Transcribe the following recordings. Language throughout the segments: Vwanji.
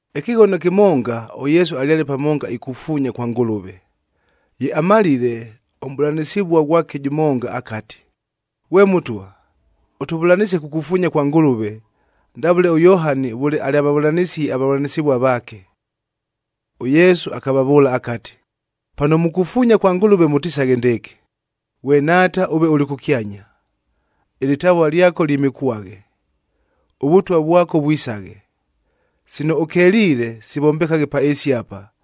Ɨkɨghono kɨmonga, ʉYesu alyale pamonga ikufuunya kwa Ngʉlʉve. Ye amalile, ʉmʼbʉlanɨsɨvua ghwake jʉmonga akati, “Ghwe Mʉtwa, ʉtʉvʉlanɨsie kukufuunya kwa Ngʉlʉve, ndavʉle ʉYohani vʉle alyavavʉlanisie avavʉlanɨsɨvua vaake.” ɄYesu akavavʉʉla akati, “Pano mukufuunya kwa Ngʉlʉve, mʉtisaghe ndɨɨkɨ, ‘Ghwe Nhaata ʉve ʉlɨ kʉkyanya,a ɨlɨtavua lyako lyɨmɨkwaghe. ɄVʉtwa vwako, vwisaghe. Sino ʉkeliile, sivombekaghe pa ɨɨsi apa,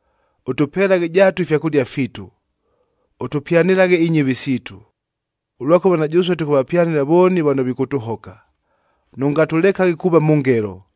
Ʉtʉpelaghe jaatu ifyakʉlia fiitu. Ʉtʉpyanɨlaghe inyɨvi siitu, ʉlwakʉva na jʉsue tʉkʉvapyanɨla vooni vano vikʉtʉhoka. Nʉngatʉlekaghe kuuva mʉ ngelo.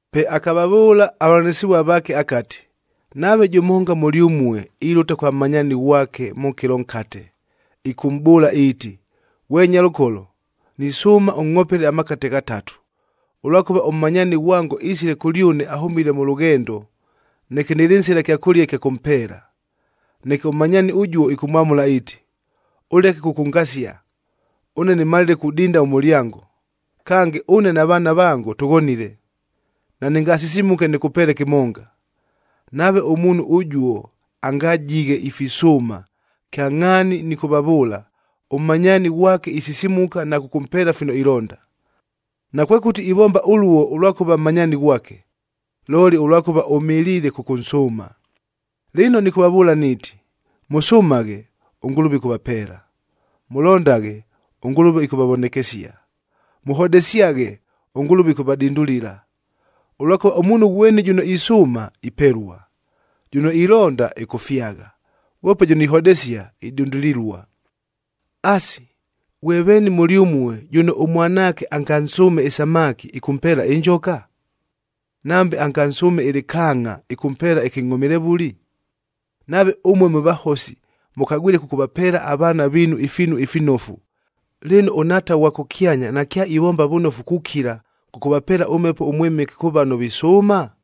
Pe akavavʉʉla avavʉlanɨsɨvua vaake akati, “Nave jʉmonga mʉlyʉmue ilʉta kwa mmanyaani ghwake mʉ kɨlo nkate, ɨkʉmʼbʉʉla iiti, ‘Ghwe nyalʉkolo, nisʉʉma ʉngʼhopele amakate ghatatu. Ʉlwakʉva, ʉmmanyaani ghwango isile kʉlyʉne ahʉmile mʉ lʉghendo, neke nɨlɨ nsila kyakʉlia ɨkya kʉmpeela.’ Neke ʉmmanyaani ʉjuo ɨkʉmwamʉla iiti, ‘Ʉleke kʉkʉngasia! Ʉne nɨmalile kudinda ʉmʉlyango! Kange, ʉne na vaana vango tʉghonile. Nanɨngasisimuke nɨkʉpeele kɨmonga!’ Nave ʉmuunhu ʉjuo angajighe ifisʉʉma, kyangʼhaani nɨkʉvavʉʉla, ʉmmanyaani ghwake isisimuka na kʉkʉmpeela fino ilonda. Nakwekʉti ivomba ʉluo ʉlwakʉva mmanyaani ghwake, looli ʉlwakʉva ʉmɨliile kʉkʉnsʉʉma. “Lɨno nɨkʉvavʉʉla niiti, mʉsʉmaghe, ʉNgʉlʉve ɨkʉvapeela; mʉlondaghe, ʉNgʉlʉve ɨkʉvavonekesia; mʉhodesyaghe, ʉNgʉlʉve ɨkʉvadindulila. Ʉlwakʉva, ʉmuunhu ghweni jʉno isʉʉma, ipelua; jʉno ilonda, ɨkʉfyagha; ghwope jʉno ihodesia, idindulilua. Asi, ghwe veeni mʉlyʉmue, jʉno ʉmwanaake angansʉʉme ɨsamaki, ɨkʉmpeela ɨnjoka? Nambe angansʉʉme ɨlɨkaangʼa, ɨkʉmpeela ɨkɨngʼhomilevʉli? Nave ʉmue mwe vahosi, mʉkagwile kʉkʉvapeela avaana viinu ifiinu ifinofu, lɨno ʉNhaata ʉghwa kʉkyanya nakyaivomba vʉnofu kukila, kʉkʉvapeela ʉMhepo ʉMwɨmɨke kʉ vano visʉʉma?”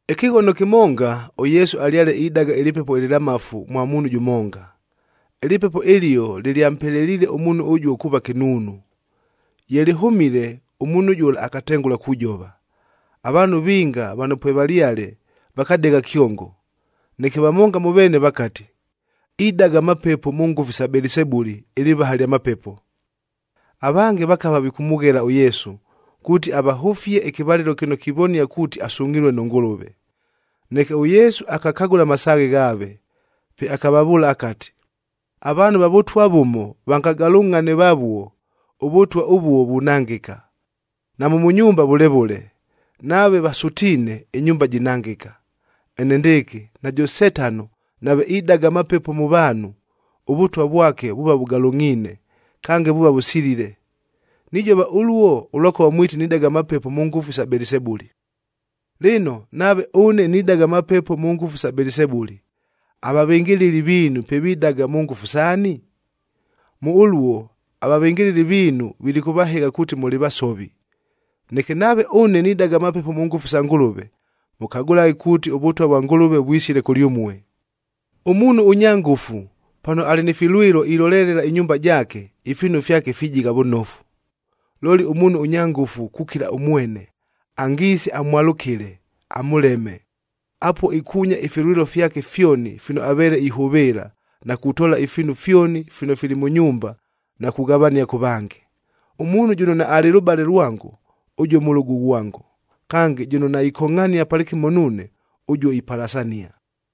Ɨkɨghono kɨmonga, ʉYesu alyale idaga ɨlɨpepo ɨlɨlamafu mwa muunhu jʉmonga. Ɨlɨpepo ɨlio lɨlyampeleliile ʉmuunhu ʉjuo kuuva kɨnuunu. Ye lɨhʉmile, ʉmuunhu jʉla akatengʉla kujova. Avaanhu vinga vano pwevalyale, vakadegha kyongo. Neke vamonga mʉ veene vakati, “Idaga amapepo mʉ ngʉfu isa Belisebuli,d ɨlɨvaha lya mapepo!” Avange vakava vikʉmʉghela ʉYesu, kuuti avahʉfie ɨkɨvalɨlo kɨno kivonia kuuti asungʼhilue nʉ Ngʉlʉve. Neke ʉYesu akakagʉla amasaaghe ghaave. Pe akavavʉʉla akati, “Avaanhu va vʉtwa vʉmo vangagalʉngʼhane vavuo, ʉvʉtwa ʉvuo vunangɨka. Namʉ mʉ nyumba vʉle vʉle, nave vasʉtiine, ɨnyumba jinangɨka. Enendɨɨkɨ, najʉ Setano nave idaga amapepo mʉ vaanhu, ʉvʉtwa vwake vuuva vʉgalʉngʼhiine, kange vuuva vʉsilile. Nijova ʉluo ʉlwakʉva mwiti nidaga amapepo mʉ ngʉfu sa Belisebuli. Lɨno, nave ʉne nidaga amapepo mʉ ngʉfu sa Belisebuli, avavɨngɨlɨli viinu pe vidaga mʉ ngʉfu saani? Mʉ ʉluo, avavɨngɨlɨli viinu vilikʉvahɨgha kuuti mʉlɨ vasovi. Neke nave ʉne nidaga amapepo mʉ ngʉfu sa Ngʉlʉve, mʉkagʉlaghe kuuti, ʉVʉtwa vwa Ngʉlʉve vwisile kʉlyʉmue. “Ʉmuunhu ʉnya ngʉfu, pano alɨ ni filwɨlo ilolelela ɨnyumba jaake, ifiinu fyake fijigha vʉnofu. Looli ʉmuunhu ʉnya ngʉfu kukila ʉmwene, angiise amwalʉkɨle amʉleme, apuo ikuunya ifilwɨlo fyake fyoni fino aveele ihʉvɨɨla, na kutoola ifiinu fyoni fino fili mʉ nyumba na kughavania kʉ vange. Ʉmuunhu jʉno naalɨ lʉbale lwango, ʉjuo mʉlʉgʉ ghwango. Kange, jʉno naikongʼhania palɨkɨmo nuune, ʉjuo ipalasania.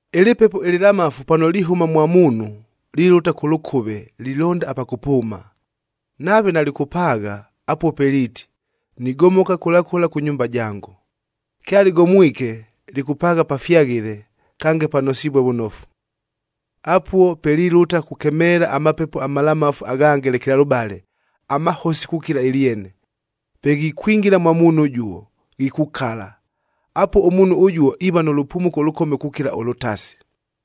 “Ɨlɨpepo ɨlɨlamafu pano lihʉma mwa muunhu, lilʉta kʉ lʉkʉve lilonda apa kʉpʉʉma. Nave nalɨkʉpaagha, apuo pe liiti, ‘Nigomoka kʉla kʉla kʉ nyumba jango.’ Kyalɨgomwike, lɨkʉpaagha pafyaghɨle, kange panosivue vʉnofu. Apuo pe lilʉta kukemeela amapepo amalamafu aghange lekelalʉbale, amahosi kukila ɨlyene. Pe ghikwingila mwa muunhu ʉjuo, ghikukala. Apuo ʉmuunhu ʉjuo iiva nʉ lʉpumuko ʉlʉkome kukila ʉlʉtasi.”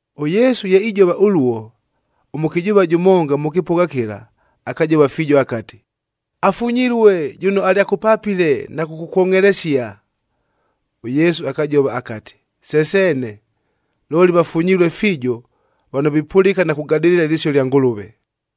ɄYesu ye ijova ʉluo, ʉmʉkɨjʉʉva jʉmonga mʉ kɨpʉgha kɨla, akajova fiijo akati, “Afunyilue jʉno alyakʉpapile na kʉkʉkwongʼhelesia!” ɄYesu akajova akati, “Se seene, looli vafunyilue fiijo vano vipʉlɨka na kugadɨlɨla ɨlɨsio lya Ngʉlʉve!”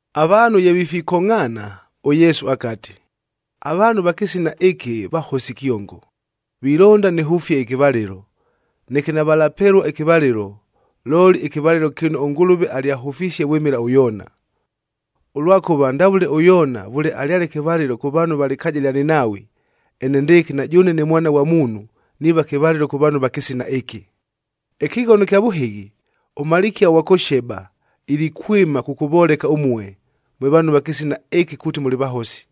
Avaanhu ye vifikongʼhaana, ʉYesu akati, “Avaanhu va kɨsina ɨkɨ vahosi kyongo! Vilonda nɨhʉfie ɨkɨvalɨlo, neke navalapelua ɨkɨvalɨlo, looli ɨkɨvalɨlo kɨno ʉNgʉlʉve alyahʉfisie vwɨmɨla ʉYoona. Ʉlwakʉva, ndavʉle ʉYoona vʉle alyale kɨvalɨlo kʉ vaanhu va lɨkaaja lya Ninaawi, enendɨɨkɨ na jʉʉne ne Mwana ghwa Muunhu, niiva kɨvalɨlo kʉ vaanhu va kɨsina ɨkɨ. “Ɨkɨghono ɨkya vʉhɨghi, ʉmalikia ʉghwa kʉ Sheba ilikwɨma kʉkʉvoleka ʉmue, mwe vaanhu va kɨsina ɨkɨ kuuti mʉlɨ vahosi.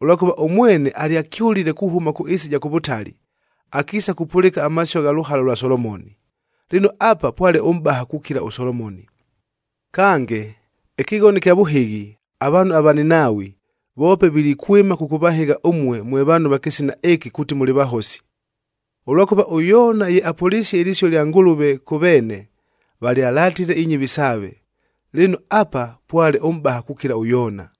Ʉlwakʉva ʉmwene alyakyʉlile kuhʉma kʉ ɨɨsi ɨja kʉ vʉtali, akiisa kupʉlɨka amasio gha lʉhala lwa Solomoni.e Lɨno, apa pwale ʉmʼbaha kukila ʉSolomoni! Kange, ɨkɨghono ɨkya vʉhɨghi, avaanhu ava Ninaawi, voope vilikwɨma kʉkʉvahɨgha ʉmue mwe vaanhu va kɨsina ɨkɨ kuuti mʉlɨ vahosi. Ʉlwakʉva ʉYoona ye apʉlisie ɨlɨsio ɨlya Ngʉlʉve kʉ veene, valyalatile inyɨvi saave.f Lɨno, apa pwale ʉmʼbaha kukila ʉYoona!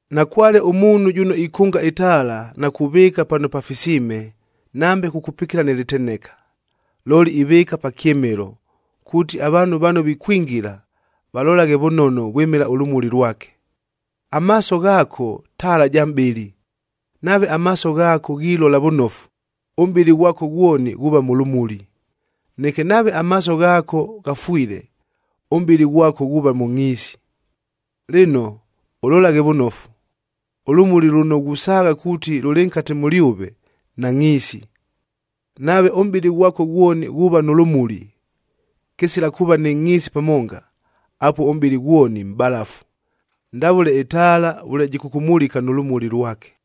“Nakwale ʉmuunhu jʉno ikʉnga ɨtaala, na kuvɨɨka pano pafisiime nambe kukupikila nɨ lɨteneka. Looli, ivɨɨka pa kyɨmɨlo, kuuti avaanhu vano vikwingila, valolaghe vʉnono vwɨmɨla ʉlʉmuli lwake. Amaaso ghaako taala ja mʼbɨlɨ. Nave amaaso ghaako ghilola vʉnofu, ʉmʼbɨlɨ ghwako ghwoni ghuuva mʉ lʉmuli. Neke nave amaaso ghaako ghafwile, ʉmʼbɨlɨ ghwako ghuuva mʉ ngʼhiisi. Lɨno, ʉlolaghe vʉnofu, ʉlʉmuli lʉno ghusaagha kuuti lʉlɨ nkate mʉlyʉve, nangʼhiisi! Nave ʉmʼbɨlɨ ghwako ghwoni ghuuva nʉ lʉmuli, kɨsila kuuva nɨ ngʼhiisi pamonga, apuo ʉmʼbɨlɨ ghwoni mʼbalafu, ndavʉle ɨtaala vʉle jɨkʉkʉmulika nʉ lʉmuli lwake.”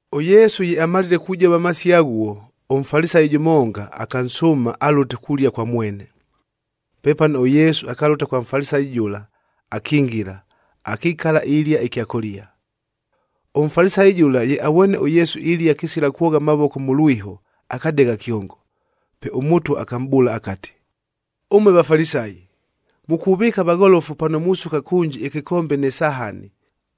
ɄYesu ye amalile kujova amasio aghuo, ʉMfalisayi jʉmonga akansʉʉma alʉte kulia kwa mwene. Pepano, ʉYesu akalʉta kwa Mfalisayi jʉla akingila, akikala ilia ɨkyakʉlia. ɄMfalisayi jʉla ye avwene ʉYesu ilia kɨsila kwogha amavoko mʉ lwiho, akadegha kyongo. Pe ʉMʉtwa akamʼbʉʉla akati, “Ʉmue Vafalisayi, mukuvɨɨka vagholofu pano musuka kʉnji ɨkɨkombe nɨ sahani,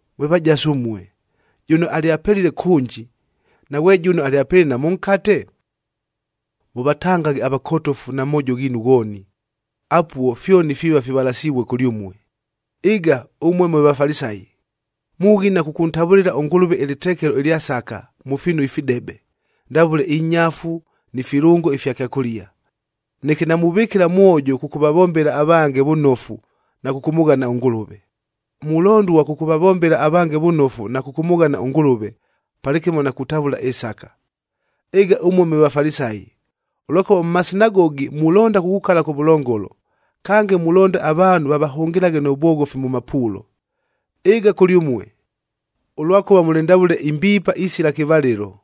Mwe vajasu ʉmue! Jʉno alyapelile kʉnji, naghwe jʉno alyapelile na mʉnkate? Mʉvatangaghe avakotofu na moojo ghiinu ghooni, apuo fyoni fiiva fivalasivue kʉlyʉmue. “Ɨga ʉmue mwe Vafalisayi! Mughina kʉkʉntavʉlɨla ʉNgʉlʉve ɨlɨtekelo ɨlya sakah mʉ fiinu ifidebe, ndavʉle ɨnyafu ni filʉngo ifya kyakʉlia. Neke namuvɨkɨla mwojo kʉkʉvavombela avange vʉnofu na kʉkʉmʉghana ʉNgʉlʉve. Mulondua kʉkʉvavombela avange vʉnofu na kʉkʉmʉghana ʉNgʉlʉve, palɨkɨmo na kutavʉla ɨsaka. Ɨga ʉmue mwe Vafalisayi! Ʉlwakʉva mʉ masinagogi mulonda kukukala kʉvʉlongolo. Kange, mulonda avaanhu vavahʉngɨlaghe nʉ vwoghofi mʉ mapuulo. Ɨga kʉlyʉmue! Ʉlwakʉva mʉlɨ ndavʉle imbiipa isila kɨvalɨlo,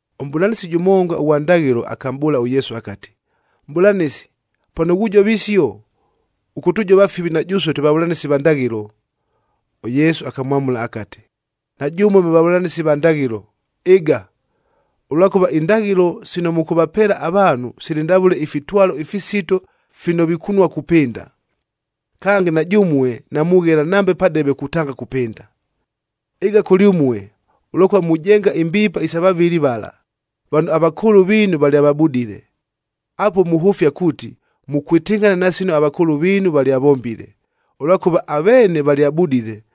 Ʉmʼbʉlanɨsi jʉmonga ʉghwa ndaghɨlo akamʼbʉʉla ʉYesu akati, “Mʼbʉlanɨsi, pano ghujova isio, ʉkʉtʉjova fivi na jʉsue twe vavʉlanɨsi va ndaghɨlo.” ɄYesu akamwamʉla akati, “Na jʉmue mwe vavʉlanɨsi va ndaghɨlo, ɨga! Ʉlwakʉva, indaghɨlo sino mʉkʉvapeela avaanhu sili ndavʉle ifitwalo ifisito fino vikunua kupɨnda. Kange, na jʉmue namughela nambe padebe kutanga kupɨnda! “Ɨga kʉlyʉmue! Ʉlwakʉva mujenga imbiipa isa vavɨli vala, vano avakʉʉlʉ viinu valyavabudile! Apuo muhʉfia kuuti, mukwɨtɨngʼhana na sino avakʉʉlʉ viinu valyavombile. Ʉlwakʉva aveene valyabudile,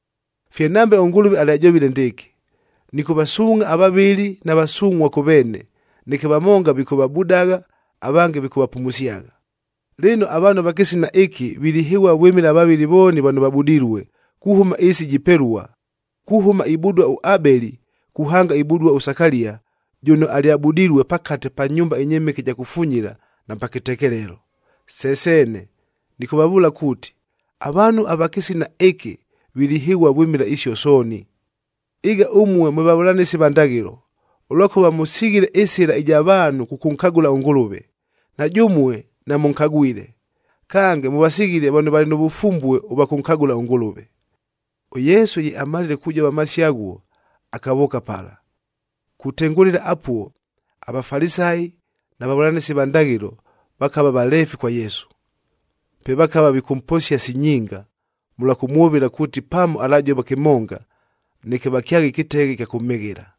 “Fye nambe ʉNgʉlʉve alyajovile ndɨɨkɨ, ‘Nɨkʉvasuungʼha avavɨli na vasungʼhua kʉ veene, neke vamonga vikʉvabudagha, avange vikʉvapumusyagha.’ Lɨno, avaanhu ava kɨsina ɨkɨ vilihɨghua vwɨmɨla avavɨli vooni vano vabudilue, kuhʉma ɨɨsi jipelua, kuhʉma ibudua ʉAbeli, kuhanga ibudua ʉSakalia,k jʉno alyabudilue pakate pa nyumba ɨnyɨmɨke ɨja kufunyila na pa kɨtekelelo. Se seene! Nɨkʉvavʉʉla kuuti, avaanhu ava kɨsina ɨkɨ vilihɨghua vwɨmɨla isio sooni. “Ɨga ʉmue mwe vavʉlanɨsi va ndaghɨlo! Ʉlwakʉva mʉsighile ɨsɨla ɨja vaanhu kʉkʉnkagʉla ʉNgʉlʉve. Na jʉmue namʉnkagwile, kange mʉvasighile vano valɨ nʉ vʉfumbue ʉvwa kʉnkagʉla ʉNgʉlʉve.” ɄYesu ye amalile kujova amasio aghuo, akavʉʉka pala. Kutengʉlɨla apuo aVafalisayi na vavʉlanɨsi va ndaghɨlo vakava valeefi kwa Yesu. Pe vakava vikʉmposia si nyinga, mʉlwa kʉmwʉvɨla kuuti pamo alajova kɨmonga, neke vakyaghe ɨkɨteghe ɨkya kʉmhɨghɨla.